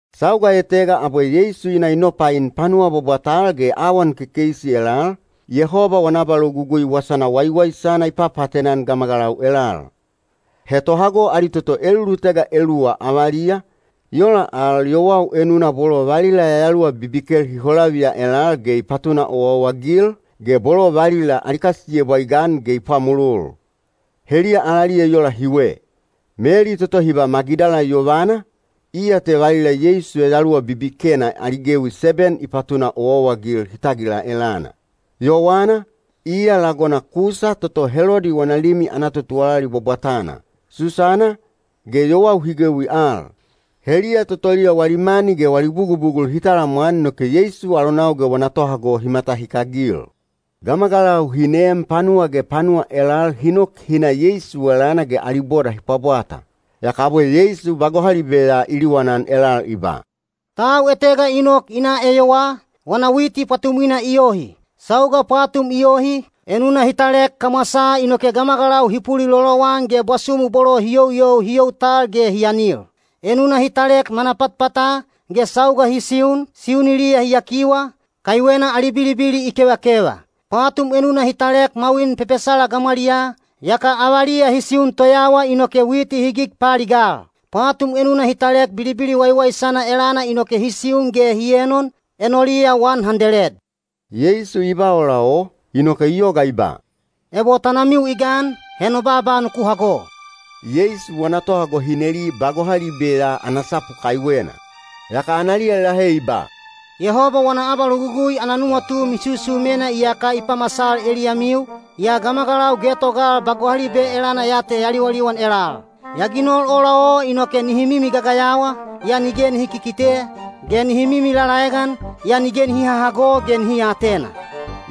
Sauga etega abwe Yeisu i na i nopain panuwa bwabwatal ge awan kekeisi elal, Yehoba wana abalogugui Wasana Waiwaisana i papaatena-an gamagalau elal. He tohago ali toto elulutega eluwa avaliya, i ola al yowau enuna bolo valila yayaluwa bibikel hi holaviya elal ge i patuna owaowa-agil, ge bolo valila ali kasiyebwa i gan ge i pwamolol. Heliya alaliya i ola hiwe: Meli toto hi ba Magidala yovana, iya te valila Yeisu yayaluwa bibikena ali gewi seben i patuna owaowa-agil hi tagila elana; Yowana, iya lagona Kusa toto Helodi wana limi ana totuwalali bwabwatana; Susana, ge yowau hi gewi al. Heliya totoliya wali mani ge wali bugubugul hi talamwan inoke Yeisu alonau ge wana tohago hi matahikagil. Gamagalau hi neem panuwa ge panuwa elal hi nok hi na Yeisu elana ge ali boda hi pwabwata. Yaka abwe Yeisu ba gohalibe ya i liwanan elal i ba, “Tau etega i nok i na eyowaa, wana witi pwatumwina i yohi. Sauga pwatum i yohi, enuna hi talek kamwasaa inoke gamagalau hi pulilolowan ge bwasumu bolo hi youyou hi you tal ge hi anil. Enuna hi talek manapatpata, ge sauga hi siun, siuniliya hi yakiwa, kaiwena ali bilibili i kevakeva. Pwatum enuna hi talek mwawin pepesala gamwaliyaa, yaka avaliya hi siun toyawa inoke witi hi gig paaligal. Pwatum enuna hi talek bilibili waiwaisana elana inoke hi siun ge hi enon, enoliya wan handeled.” Yeisu i ba ola o, inoke i yoga i ba, “Ebo tanamiu i gan, he no baaba nuku hago.” Yeisu wana tohago hi neli ba gohalibe ya ana sapu kaiwena. Yaka analiya i lahe i ba, “Yehoba wana abalogugui ana nuwatu misusumena iyaka i pamasal eliyamiu, yaa gamagalau getogal ba gohalibe elana ya te ya liwaliwan elal. Ya ginol ola o inoke nihi mimi gagayawa, yaa nige nihi kikite, ge nihi mimi lalaegan, yaa nige nihi hahago ge nihi aatena.”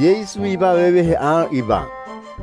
Yeisu i ba vevehe al i ba,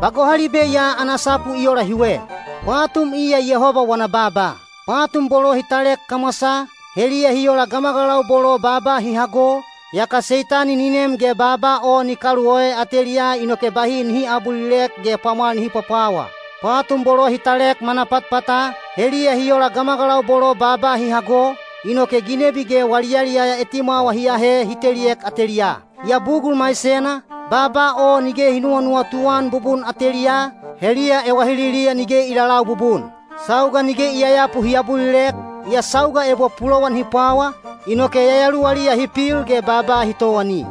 “Ba gohalibe ya ana sapu i ola hiwe. Pwatum iya Yehoba wana baaba. Pwatum bolo hi talek kamwasaa, heliya hi ola gamagalau bolo baaba hi hago, yaka Seitani ni nem ge baaba o ni kaluoe ateliyaa inoke bahi nihi aabulilek ge pwamwal nihi pwapwawa. Pwatum bolo hi talek manapatpata, heliya hi ola gamagalau bolo baaba hi hago, inoke ginebi ge wali yaliyaya etimwawa hi ahe hi teliek ateliyaa. Yaa bugul maisena, baaba o nige hi nuwanuwatu-an bubun ateliyaa, heliya ewahililiya nige i lalau bubun. Sauga nige i yayapu hi abulilek, yaa sauga ebo pulowan hi pwawa, inoke yayaluwaliya hi pil ge baaba hi towani.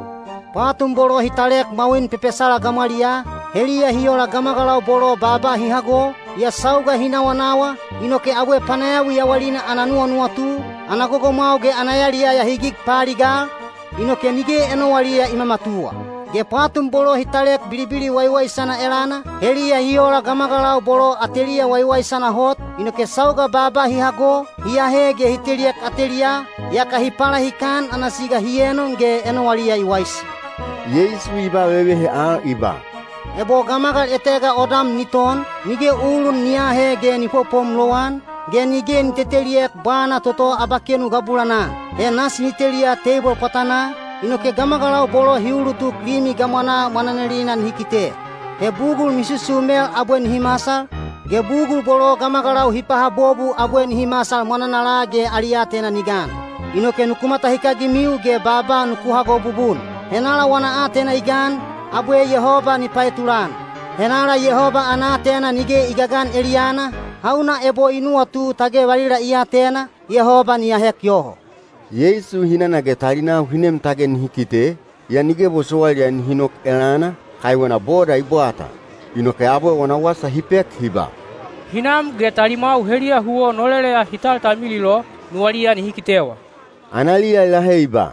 Pwatum bolo hi talek mwawin pepesala gamwaliyaa, heliya hi ola gamagalau bolo baaba hi hago, yaa sauga hi nawanawa, inoke abwe panayawi yawalina ana nuwanuwatu, ana gogomwau ge ana yaliyaya hi gig paaligal, inoke nige enowaliya i mamatuwa. Ge pwatum bolo hi talek bilibili waiwaisana elana, heliya hi ola gamagalau bolo ateliya waiwaisana hot, inoke sauga baaba hi hago, hi ahe ge hi teliek ateliyaa, yaka hi palahikan ana siga hi enon ge enowaliya i waisi.” Yeisu i ba vevehe al i ba, “Ebo gamagal etega odam ni ton, nige ulun ni aahe ge ni popom lowan, ge nige ni teteliek bwana toto abakenu gabulanaa. He nasi ni teliya teibol pwatanaa, inoke gamagalau bolo hi uulutuk limi gamwanaa mwananalina nihi kite. He bugul misusumel abwe nihi masal, ge bugul bolo gamagalau hi pahabobu abwe nihi masal mwananala ge ali aatena ni gan. “Inoke nuku matahikagimiu ge baaba nuku hago bubun. Henala wana aatena i gan, abwe Yehoba ni paetulan. Henala Yehoba ana aatena nige i gagan eliyana, hauna ebo i nuwatu tage valila i atena, Yehoba ni ahek yoho.” Yeisu hinana ge talinau hi nem tage nihi kite, yaa nige bosowailiya nihi nok elana, kaiwena boda i bwata. Inoke abwe wana wasa hi pek hi ba, “Hinam ge talimwau heliya huwo noleleya hi taltalmilil o, nuwaliya nihi kitewa.” Analiya i lahe i ba,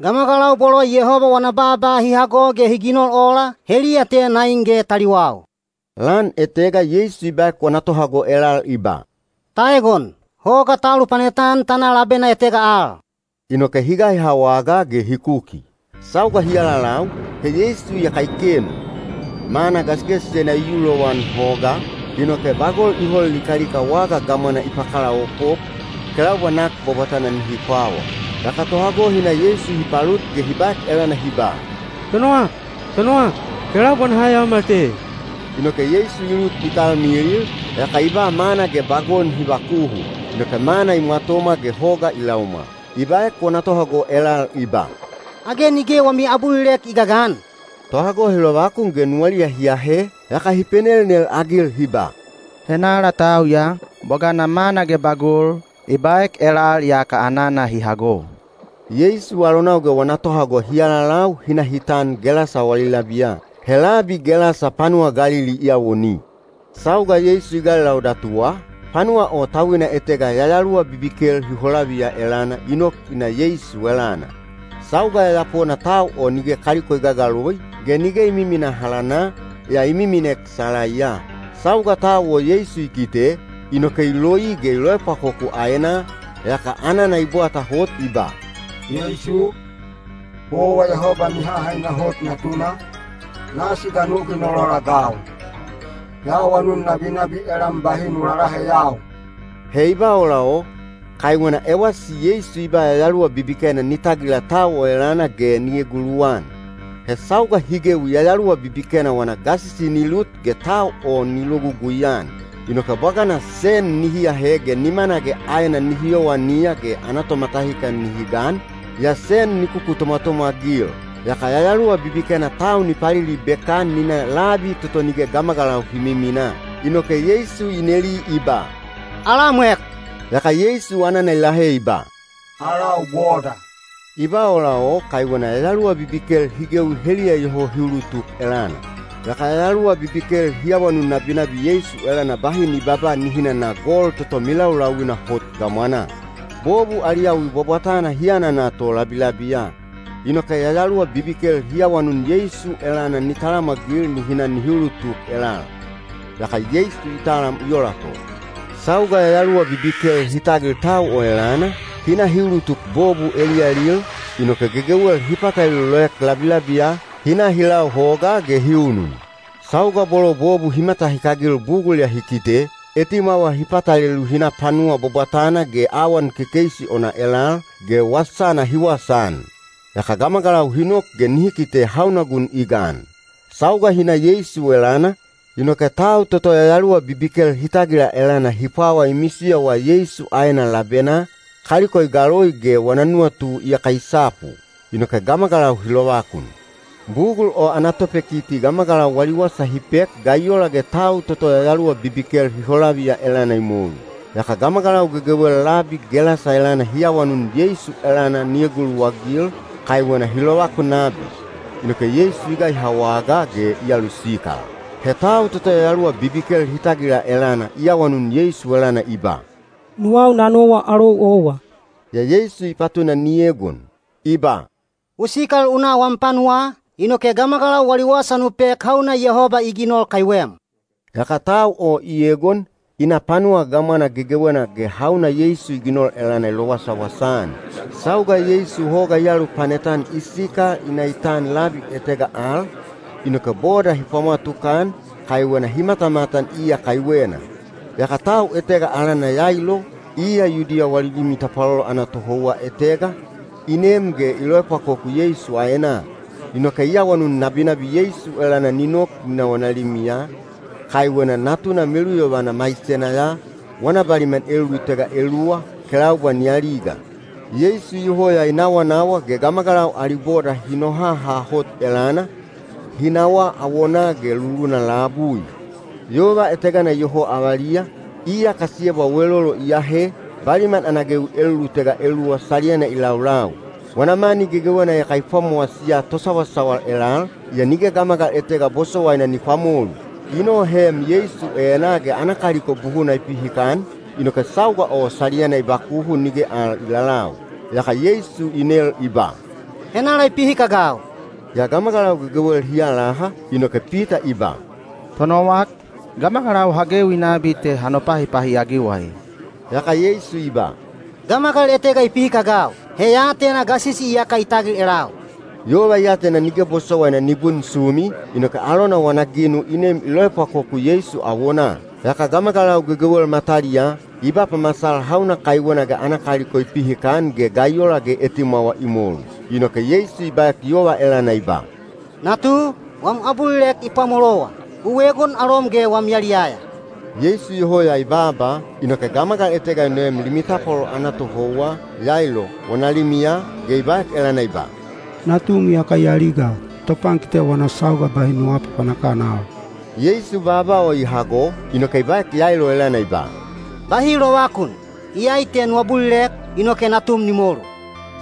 “Gamagalau bolo Yehoba wana baaba hi hago ge hi ginol ola, heliya te nain ge taliwau.” Lan etega Yeisu i baek wana tohago elal i ba, “Ta egon! Hoga ta alupanet-an ta na labena etega al.” Inoke hi gaiha wagaa ge hi kuki. Sauga hi alalau, he Yeisu iyaka i kenu. Mana gasigasisena i yu lowan hogaa, inoke bagol i hol likalika waga gamwana i pakalaopop, kelaubwa nak bwabwatana nihi pwawa. Yaka tohago hi na Yeisu hi palut ge hi baek elana hi ba, “Tonowak! Tonowak! Kelaubwa naha yaomal te.” Inoke Yeisu i lut i talmilil, yaka i ba mana ge bagol nihi bakuhu. Inoke mana i mwatomwa ge hoga i laumwal. I baek wana tohago elal i ba, “Age nige wami abulilek i gagan?” Tohago hi lovakun ge nuwaliya hi ahe, yaka hi penelnel-agil hi ba, “Henala tau ya? Bwagana mana ge bagol, i baek elal yaka anana hi hago.” Yeisu alonau ge wana tohago hi alalau hi na hi tan Gelasa wali labiya. He labi Gelasa panuwa Galili i awoni. Sauga Yeisu i gailau datuwa, panuwa o tauina etega yayaluwa bibikel hi holaviya elana i nok i na Yeisu elana. Sauga yayapona tau o nige kaliko i gagaloi, ge nige i miminaa halana, yaa i miminek salaiya. Sauga tau o Yeisu i kite, inoke i loi ge i loepwakoku aenaa, yaka anana i bwata hot i ba, “Yeisu, owa Yehoba Mihahaina Hot Natuna, nasi ga nu ginol ola-agau? Ya awanun nabinabi elam bahi nu lalaheyau!” He i ba ola o, kaiwena ewasi Yeisu i ba yayaluwa bibikena ni tagila tau o elana ge ni eguluwan. He sauga hi gewi yayaluwa bibikena wana gasisi ni lut ge tau o ni logugui-an. Inoke bwagana sen nihi ahe ge nimana ge aena nihi yowaniya ge ana tomatahikan nihi gan, yaa sen ni kukutomwatomwa-agil. Yaka yayaluwa bibikena tau ni palilibek-an ni na labi toto nige gamagalau hi miminaa. Inoke Yeisu i neli i ba, “Alamwek?” Yaka Yeisu anana i lahe i ba, “Alau Boda.” I ba ola o kaiwena yayaluwa bibikel hi gewi heliya iyoho hi ulutuk elana. Yaka yayaluwa bibikel hi awanun nabinabi Yeisu elana bahi ni babaa nihi nana gol toto milaulauina hot gamwanaa. Bobu ali yawi bwabwatana hi anana to labilabiya. Inoke yayaluwa bibikel hi awanun Yeisu elana ni talamwagil nihi na nihi ulutuk elal. Yaka Yeisu i talam i ola to. Sauga yayaluwa bibikel hi tagil tau o elana, hi na hi ulutuk bobu eliyalil, inoke gegewel hi patalelu loek labilabiya, hi na hi lau hogaa ge hi unun. Sauga bolo bobu hi matahikagil bugul ya hi kite, etimwawa hi patalelu hi na panuwa bwabwatana ge awan kekeisi ona elal, ge wasana hi wasaan. Yaka gamagalau hi nok ge nihi kite hauna gun i gan. Sauga hi na Yeisu elana, inoke tau toto yayaluwa bibikel hi tagila elana hi pwawa i misiyowa Yeisu aena labenaa, kaliko i galoi ge wana nuwatu iyaka i sapu. Inoke gamagalau hi lovakun. Bugul o ana topekiti gamagalau wali wasa hi pek ga i ola ge tau toto yayaluwa bibikel hi holaviya elana i molu. Yaka gamagalau gegewel labi Gelasa elana hi awanun Yeisu elana ni eguluwagil, kaiwena hi lovakun nabi. Inoke Yeisu i gaiha wagaa ge i alusikal. He tau toto yayaluwa bibikel hi tagila elana i awanun Yeisu elana i ba, “Nuwau na nowa alou owa.” Yaa Yeisu i patuna ni egon, i ba, “U sikal u na wam panuwaa, inoke gamagalau wali wasa nu pek hauna Yehoba i ginol kaiwem.” Yaka tau o i egon, i na panuwa gamwana gegewena ge hauna Yeisu i ginol elana i lowasawasa-an. Sauga Yeisu hoga i alupanet-an i sikal i na i tan labi etega al, inoke boda hi pwamwa tukan, kaiwena hi matamatan iya kaiwena. Yaka tau etega alana Yailo, iya Yudiya wali limi tapwalolo ana tohouwa etega, i nem ge i loepwakoku Yeisu aenaa. Inoke i awanun nabinabi Yeisu elana ni nok ni na wana limiya, kaiwena natuna meluyovana maisena ya, wana baliman elulutega eluwa, kelaubwa ni aliga. Yeisu iyoho ya i nawanawa ge gamagalau ali boda hi nohaha hot elana, hi nawaa awonaa ge luluna labui. Yova etegana iyoho avaliya, iya kasiyebwa welolo i ahe, baliman ana gewi elulutega eluwa saliyana i laulau. Wana mani gegewena iyaka i pwamowasiya tosawasawal elal, yaa nige gamagal etega bosowaina ni pwamolu. I noheem Yeisu enaa ge ana kaliko buhuna i pihikan, inoke sauga o saliyana i bakuhu nige al i lalau. Yaka Yeisu i nel i ba, “Henala i pihikagau?” Yaa gamagalau gegewel hi alaha, inoke Pita i ba, “Tonowak, gamagalau ha gewi nabi te ha nopahipahi-agiwa ee.” Yaka Yeisu i ba, “Gamagal etega i pihikagau. He ya atena gasisi iyaka i tagil elau.” Yova i atena nige bosowaina ni bunsumi, inoke alona wana ginu i nem i loepwakoku Yeisu awonaa. Yaka gamagalau gegewel mataliyaa, i ba pamasal hauna kaiwena ge ana kaliko i pihikan ge ga i ola ge etimwawa i molu. Inoke Yeisu i baek yova elana i ba, “Natu, wam abulilek i pwamolowa. U egon alom ge wam yaliyaya.” Yeisu iyoho ya i baaba, inoke gamagal etega i noem limi tapwalolo ana tohouwa, Yailo, wana limiya, ge i baek elana i ba, “Natum iyaka i aliga. Topankite wana sauga bahi nu aapapanak-an al.” Yeisu baaba o i hago, inoke i baek Yailo elana i ba, “Bahi lovakun! Iyai te nu abulilek, inoke natum ni molu.”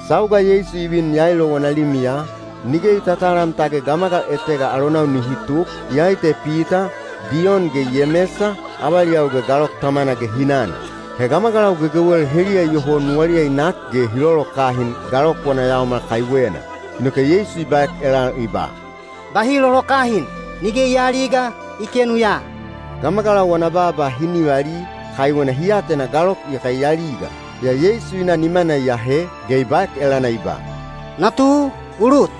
Sauga Yeisu i vin Yailo wana limiya, nige i tatalam tage gamagal etega alonau nihi tuk, iyai te Pita, Diyon ge Yemesa, avaliyau ge galok tamana ge hinana. He gamagalau gegewel heliya iyoho nuwaliya i nak ge hi lolokahin galok wana yaomal kaiwena. Inoke Yeisu i baek elal i ba, “Bahi lolokahin! Nige i aaliga, i kenu ya.” Gamagalau wana baaba hi nivali, kaiwena hi atena galok iyaka i aliga. Yaa Yeisu i na nimana i ahe, ge i baek elana i ba, “Natu, u lut!”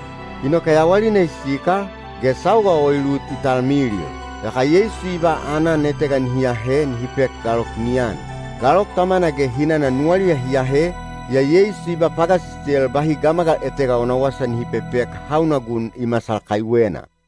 Inoke yawalina i sikal, ge sauga o i lut i talmilil. Yaka Yeisu i ba aanan etega nihi ahe nihi pek galok ni an. Galok tamana ge hinana nuwaliya hi ahe, yaa Yeisu i ba pagasisel bahi gamagal etega wana wasa nihi pepek hauna gun i masal kaiwena.